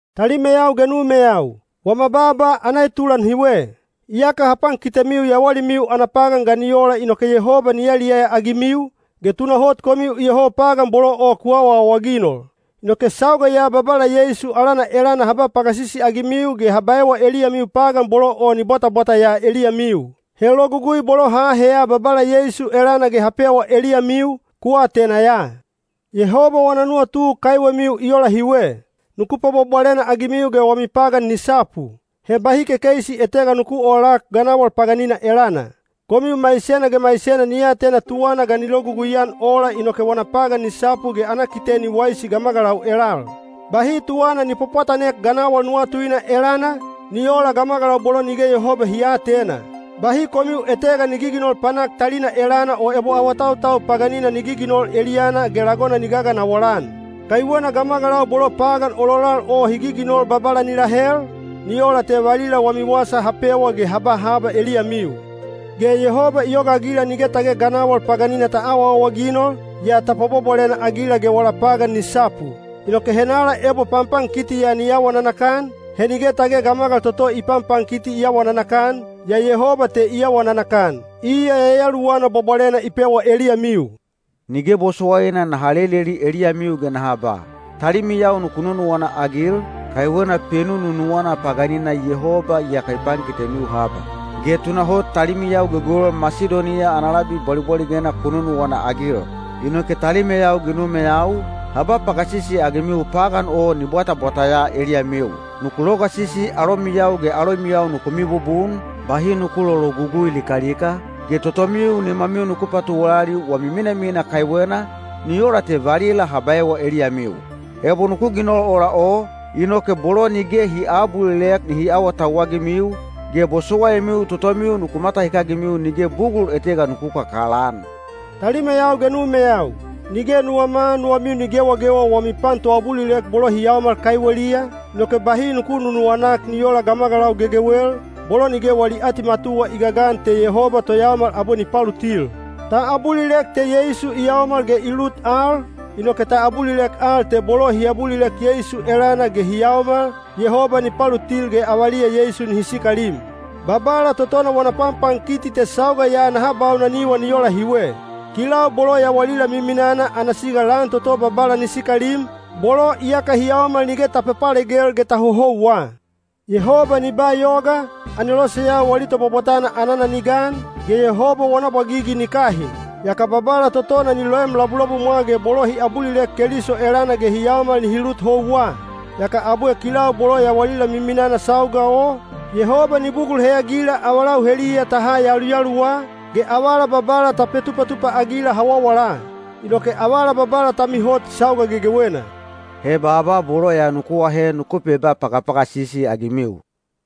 Talimeyau ge numeyau, wama baaba ana etulan hiwe. Iyaka ha pankitemiu yawalimiu ana pagan ga ni ola inoke Yehoba ni yaliyaya-agimiu, ge tunahot komiu iyoho pagan bolo o ku awaawaginol. Inoke sauga ya Babala Yeisu alana elana ha ba pagasisi-agimiu ge ha baewa eliyamiu pagan bolo o ni bwatabwata ya eliyamiu. He logugui bolo ha aheya Babala Yeisu elana ge ha pewa eliyamiu, ku atena ya. Yehoba wana nuwatu kaiwemiu i ola hiwe: nuku pwabwabwalena-agimiu ge wami pagan ni sapu. He bahi kekeisi etega nuku oolak ganawal paganina elana. Komiu maisena ge maisena ni atena tuwana ga ni logugui-an ola inoke wana pagan ni sapu ge ana kite ni waisi gamagalau elal. Bahi tuwana ni pwapwatanek ganawal nuwatuina elana, ni oola gamagalau bolo nige Yehoba hi aatena. Bahi komiu etega ni giginol panak talina elana o ebo awatautau paganina ni giginol eliyana ge lagona ni gaganawal-an. Kaiwena gamagalau bolo pagan ololal o hi giginol Babala ni lahel, ni ola te valila wami wasa ha pewa ge ha ba haba eliyamiu. Ge Yehoba i yogaagila nige tage ganawal paganina ta awaawaginol, yaa ta pwabwabwalena-agila ge wala pagan ni sapu. Inoke henala ebo panpankiti ya ni awa nanakan, he nige tage gamagal toto i panpankiti i awa nanakan, yaa Yehoba te i awa nanakan, iya Yayaluwana Bwabwalena i pewa eliyamiu. Nige bosowaina naha leleli eliyamiu ge naha ba, “Talimiyau nuku nunuwana-agil,” kaiwena penununuwana paganina Yehoba iyaka i pankitemiu haba. Ge tunahot talimiyau gegewel Masidoniya ana labi bwalibwaligena ku nunuwana-agil. Inoke talimeyau ge numeyau, ha ba pagasisi-agimiu pagan o ni bwatabwata ya eliyamiu. Nuku logasisi alomiyau ge alomiyau nuku mibubun, bahi nuku lologugui likalika, ge totomiu nimamiu nuku patuwalali wami minamina kaiwena, ni ola te valila ha baewa eliyamiu. Ebo nuku ginol ola o, inoke bolo nige hi aabulilek nihi awatauwagimiu, ge bosowaimiu totomiu nuku matahikagimiu nige bugul etega nuku kakalaan. Talimeyau ge numeyau, nige nuwama nuwamiu ni gewagewa wami pan toabulilek bolo hi yaomal kaiweliya, inoke bahi nuku nunuwanak ni oola gamagalau gegewel, bolo nige wali atimatuwa i gagan te Yehoba toyaomal abwe ni palutil. Ta abulilek te Yeisu i yaomal ge i lut al, inoke ta abulilek al te bolo hi abulilek Yeisu elana ge hi yaomal, Yehoba ni palutil ge avaliya Yeisu nihi sikalim. Babala totona wana panpankiti te sauga ya naha baunaniwa ni ola hiwe. Kilau bolo yawalila miminana ana siga lan toto Babala ni sikalim, bolo iyaka hi yaomal nige ta papalegel ge ta hohouwa. Yehoba ni ba yoga, aneloseyau wali tobwabwatana anana ni gan, ge Yehoba wana bwagigi ni kahin. Yaka Babala totona ni loem labulabumwa ge bolo hi abulilek Keliso elana ge hi yaomal nihi lut houwa. Yaka abwe kilau bolo yawalila miminana sauga o, Yehoba ni bugul heyagila avalau heliya ta ha yaluyaluwa, ge avala Babala ta petupatupa-agila hawawala. Inoke avala Babala ta mihot sauga gegewena. He baaba bolo ya nuku ahe nuku peba pagapagasisi-agimiu.